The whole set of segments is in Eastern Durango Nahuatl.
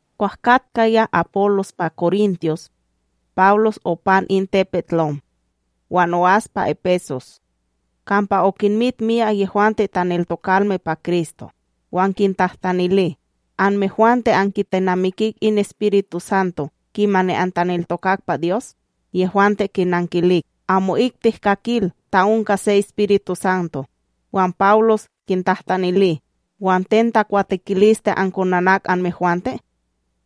Kwah katkaya Apólos pa Korintos, Pawlos opan in tepetLom wan o'as pa Epesos, kampa okinmit miyak yehwante taneltokalme pa Kristo. Wan kintahtanili: —Anmehwante ankitenamikik in EspirituSanto, kimani antaneltokak pa Dyos? Yehwante kinankilik: —Amo'ik tihkakil ta onka se EspirituSanto. Wan Pawlos kintahtanili: —Wan ten takwatekiliste ankonanak anmehwante?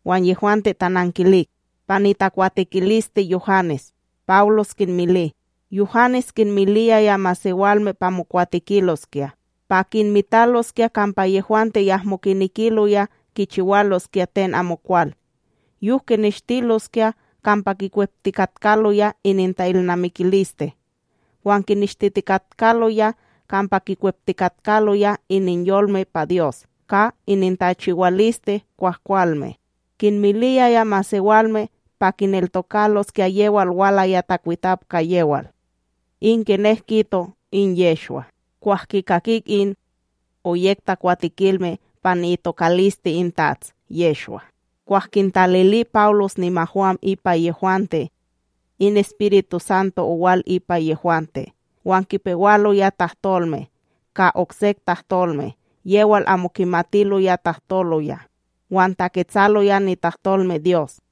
Wan yehwante tanankilik: —Pa nitakwatekiliste Yuhanes. Pawlos kinmili: —Yuhanes kinmiliyaya masewalme pa mokwatekiloskya pa kinmitaloskya kampa yehwante yahmo kinekiloya kichiwaloskya ten amokwal yok kineshtiloskya kampa kikweptikatkaloya ininta'ilnamikiliste wan kineshtitikatkaloya kampa kikweptikatkaloya ininyolme pa Dyos ka inintachiwaliste kwahkwalme. Kinmiliyaya masewalme pa kineltokaloskya yewal walaya takwitap ka yewal, in kinek kito in Yehshwa. Kwah kikakik in, oyek takwatekilme pa ni'itokaliste in TATS Yehshwa; kwah kintalili Pawlos nimahwam ipa yehwante, in EspirituSanto owal ipa yehwante wan kipewaloya tahtolme ka oksek tahtolme yewal amo kimatiloya tahtoloya wan taketsaloya nitahtolmeDyos.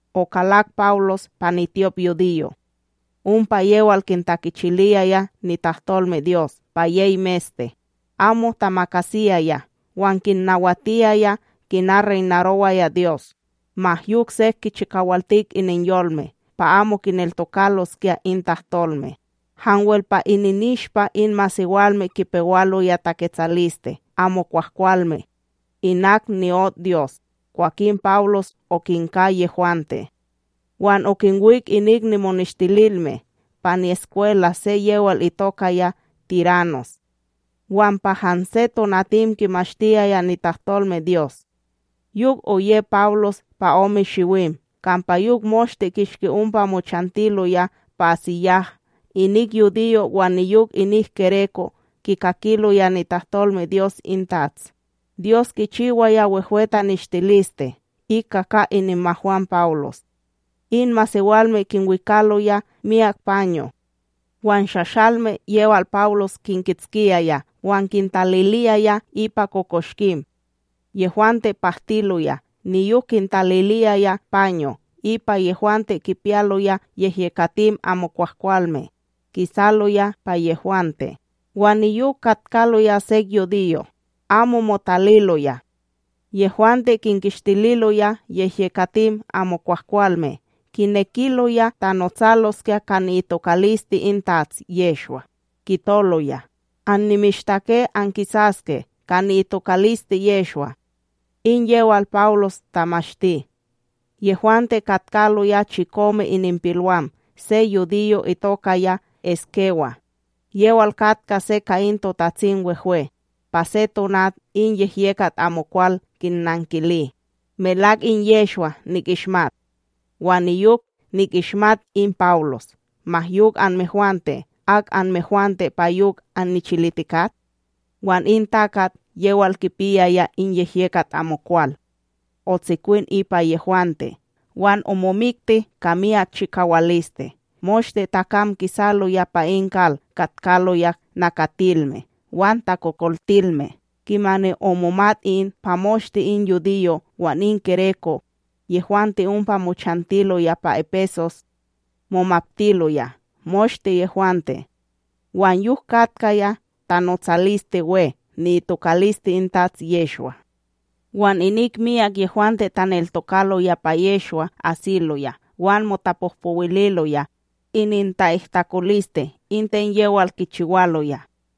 Okalak Pawlos pa nityopYudiyo' ompa yewal kintakichiliyaya nitahtolmeDyos pa yey meste, amo tamakasiyaya wan kinnawatiyaya kina reynarowaya Dyos. Ma yok sek kichikawaltik ininyolme pa amo kineltokaloskya in tahtolme. Hanwel pa ininishpa in masewalme kipewaloya taketsaliste amo kwahkwalme inak ni'ot Dyos. Kwakin Pawlos okinka yehwante, wan okinwik inik nimoneshtililme pa ni'eskwela se yewal itokaya Tiranos, wan pa hanse tonatim kimashtiyaya nitahtolmeDyos. Yok oye Pawlos pa ome shiwim, kampa yok moshte kishki ompa mochantiloya pa AsíYah, inik yudiyo' wan niyok inik gereko' kikakiloya nitahtolmeDyos in TATS. Dyos kichiwaya wehwe taneshtiliste ika ka ininmahwam Pawlos, in masewalme kinwikaloya miyak paño' wan shahsalme yewal Pawlos kinkitskiyaya wan kintalililoya ipa kokoshkim, yehwante pahtiloya niyok yehwante kipiyaloya yehyekatim amokwahkwalme kisaloya pa yehwante. Wan niyok katkaloya sek yudiyo' amo motaliloya, yehwante kinkistililoya yehyekatim amokwahkwalme kinekiloya tanotsaloskya ka ni'itokaliste in TATS Yehshwa, kitoloya: —Annimishtake ankisaske ka ni'itokaliste Yehshwa, in yewal Pawlos tamashti. Yehwante katkaloya chikome ininpilwam se yudiyo itokaya Eskéwa, yewal katka se ka in TotatsimWehwe. Pa se tonat in yehyekat amokwal kinnankili: —Melak in Yehshwa nikishmat, wan niyok nikishmat in Pawlos; ma yok anmehwante, ak anmehwante pa yok annichilitikat? Wan in takat yewal kipiyaya in yehyekat amokwal, otsikwin ipa yehwante wan omomikti ka miyak chikawaliste moshte takam kisaloya pa in kal katkaloya nakatilme wan takokoltilme. Kimani omomat in, pa moshte in yudiyo' wan in gereko' yehwante ompa mochantiloya pa Epesos, momaptiloya moshte yehwante wan yok katkaya tanotsaliste we ni'itokaliste in TATS Yehshwa. Wan inik myak yehwante taneltokaloya pa Yehshwa asiloya wan motapohpowililoya ininta'ihtakoliste in ten yewal kichiwaloya,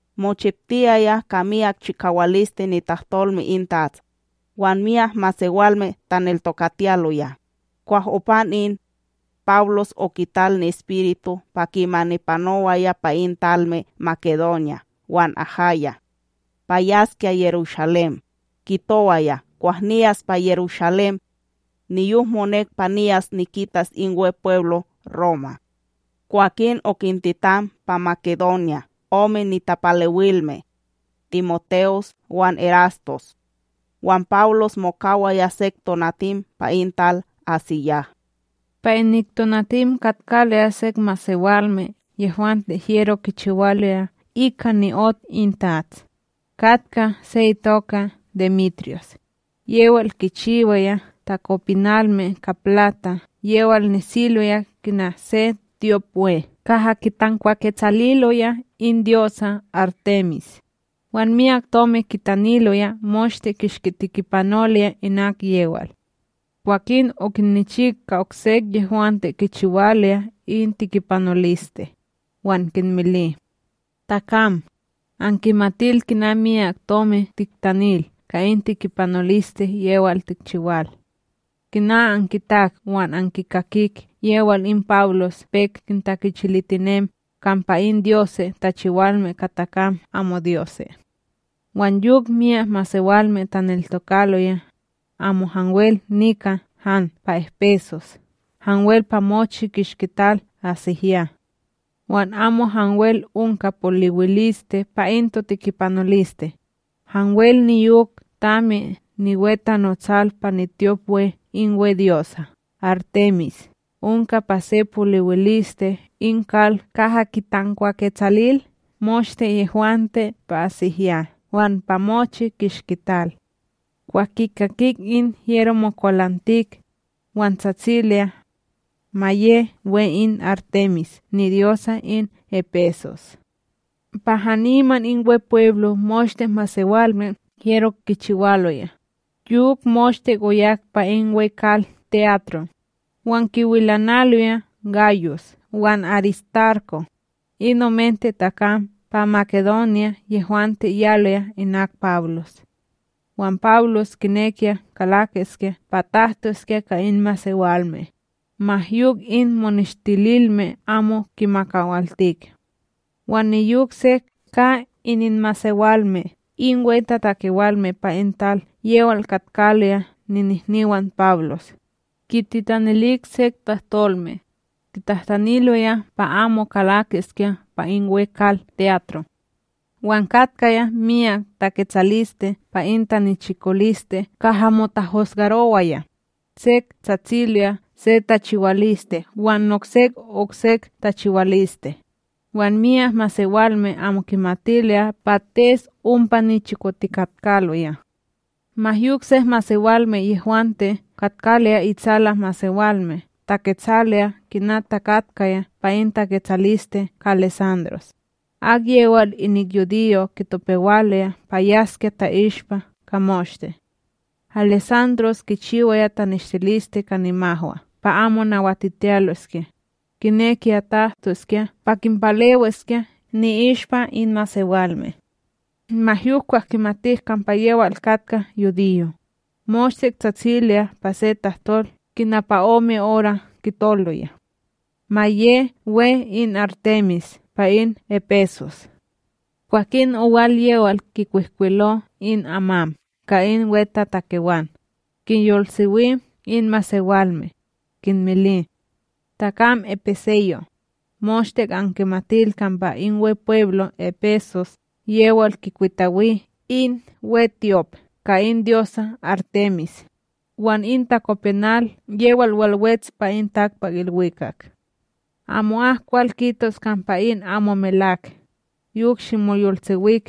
Mochiptiyaya ka miyak chikawaliste nitahtolme in TATS wan myak masewalme taneltokatiyaloya. Kwan opan in, Pawlos okital ni'espiritu pa kimani panowaya pa in talme Makedonya wan Ahaya, pa yaskya Yerushalém. Kitowaya kwah niyas pa Yerushalém, niyok monek pa niyas nikitas in Wepweblo Roma. Kwakin okintitan pa Makedonya ome nitapalewilme, TimoTe'os wan Erastos, wan Pawlos mokawaya sek tonatim pa in tal AsíYah. Pa inik tonatim katkaloya sek masewalme yehwante hyero kichiwaloya ika ni'ot in TATS, katka se itoka Demetriyos, yewal kinchiwaya takopinalme ka plata yewal nesiloya kina in se tyopWe kaha kitankwaketsaliloya in dyosa Artemis, wan miyak tomi kitaniloya moshte kishki tekipanoloya inak yewal. Kwakin okinnichik ka oksek yehwante kichiwaloya in tekipanoliste, wan kinmili: —Takam, ankimatil kina miyak tomi tiktanil ka in tekipanoliste yewal tikchiwal; kina ankitak wan ankikakik yewal in Pawlos pek kintakichilitinem kampa in dyose' tachiwalme ka takam amo dyose'; wan yok myak masewalme taneltokaloya, amo hanwel nika han pa Epesos hanwel pa mochi kishki tal AsíYah. Wan amo hanwel onka poliwiliste pa in totekipanoliste, hanwel niyok tami niwetanotsal pa nityopWe in wedyosa Artemis onka pa se poliwiliste in kal kaha kitankwaketsalil moshte yehwante pa AsíYah wan pa mochi kishki tal. Kwah kikakik in, hyero mokwalantik, wan tsatsiloya: —Ma ye we in Artemis nidyosa in Epesos! Pa haniman in Wepweblo moshte masewalme hyero kichiwaloya, yok moshte oyak pa in weKal te'atro, wan kiwilanaloya Gayus wan Aristarko', in omente takam pa Makedonya yehwante yaloya inak Pawlos. Wan Pawlos kinekiya kalakiskya pa tahtoskya ka in masewalme, ma yok in moneshtililme amo kimakawaltik. Wan niyok sek ka ininmasewalme in wehwetatakewalme pa in tal yewal katkaloya ninihniwan Pawlos, kititanilik sek tahtolme, kitahtaniloya pa amo kalakiskya pa in wekal te'atro. Wan katkaya miyak taketsaliste pa in tanichikoliste kaha motahusgarowaya, sek tsatsiloya se tachiwaliste wan noksek oksek tachiwaliste, wan myak masewalme amo kimatiloya pates ompa nichikotikatkaloya. Ma yok sek yehwante katkaloya itsala masewalme taketsaloya kina takatkaya pa in taketsaliste ka Alesandros, akyewal inik yudiyo' kitopewaloya pa yaskya ta'ishpa ka moshte. Alesandros kichiwaya taneshtiliste ka nimahwa pa amo nawatitiyaloskya, kinekiya tahtoskya pa kinpalewiskya ni'ishpa in masewalme. Ma yok kwah kimatik kampa yewal katka yudiyo, moshte tsatsiloya pa se tahtol kina pa ome ora kitoloya: —Ma ye we in Artemis pa in Epesos! Kwakin owal yewal kinkwihkwilo in amam ka in wetatakewan, kinyolsewi in masewalme, kinmili: —Takam epeseyo', moshte ankimatil kampa in Wepweblo Epesos yewal kikwitawi in wetyop ka in dyosa Artemis, wan in takopinal yewal walwets pa in takpakIlwikak. Amo'ak kwal kitos kampa in amo melawak, ma yok simoyolsewik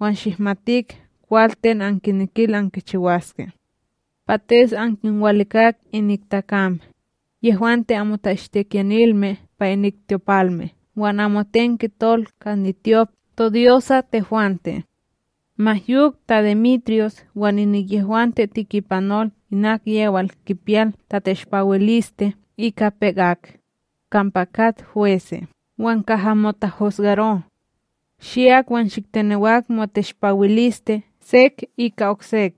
wan shihmatik kwal ten ankinekil ankichiwaske. Pates ankinwalikak inik takam, yehwante amo ta'ishtikiyanilme pa inik tyopalme wan amoten kitol ka nityop todyosa tehwante. Ma yok, ta Demetriyos wan inik yehwante tekipanol inak yewal kipiyal tateshpawiliste ika pek ak, kampa kat hwese' wan kaha motahusgaro'; shiyak wan shiktenewak moteshpawiliste sek ika oksek.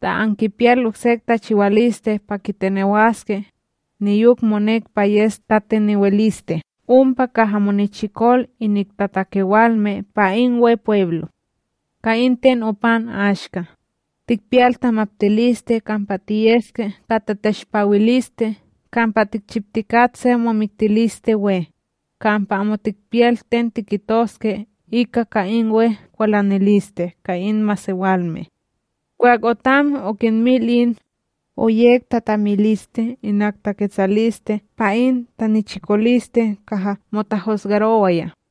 Ta ankipiyal oksek tachiwaliste pa kitenewaske, niyok monek pa yes tatenewiliste ompa kaha monichikol inik tatakewalme pa in Wepweblo; ka in ten opan ashka, tikpiyal tamaptiliste kampa tiyeske ka tateshpawiliste kampa tikchiptikat se momiktiliste we, kampa amo tikpiyal ten tikitoske ika ka in we kwalaniliste ka in masewalme. Kwah otam okinmil in, oyek tatamiliste inik taketsaliste pa in tanichikoliste kaha motahusgarowaya.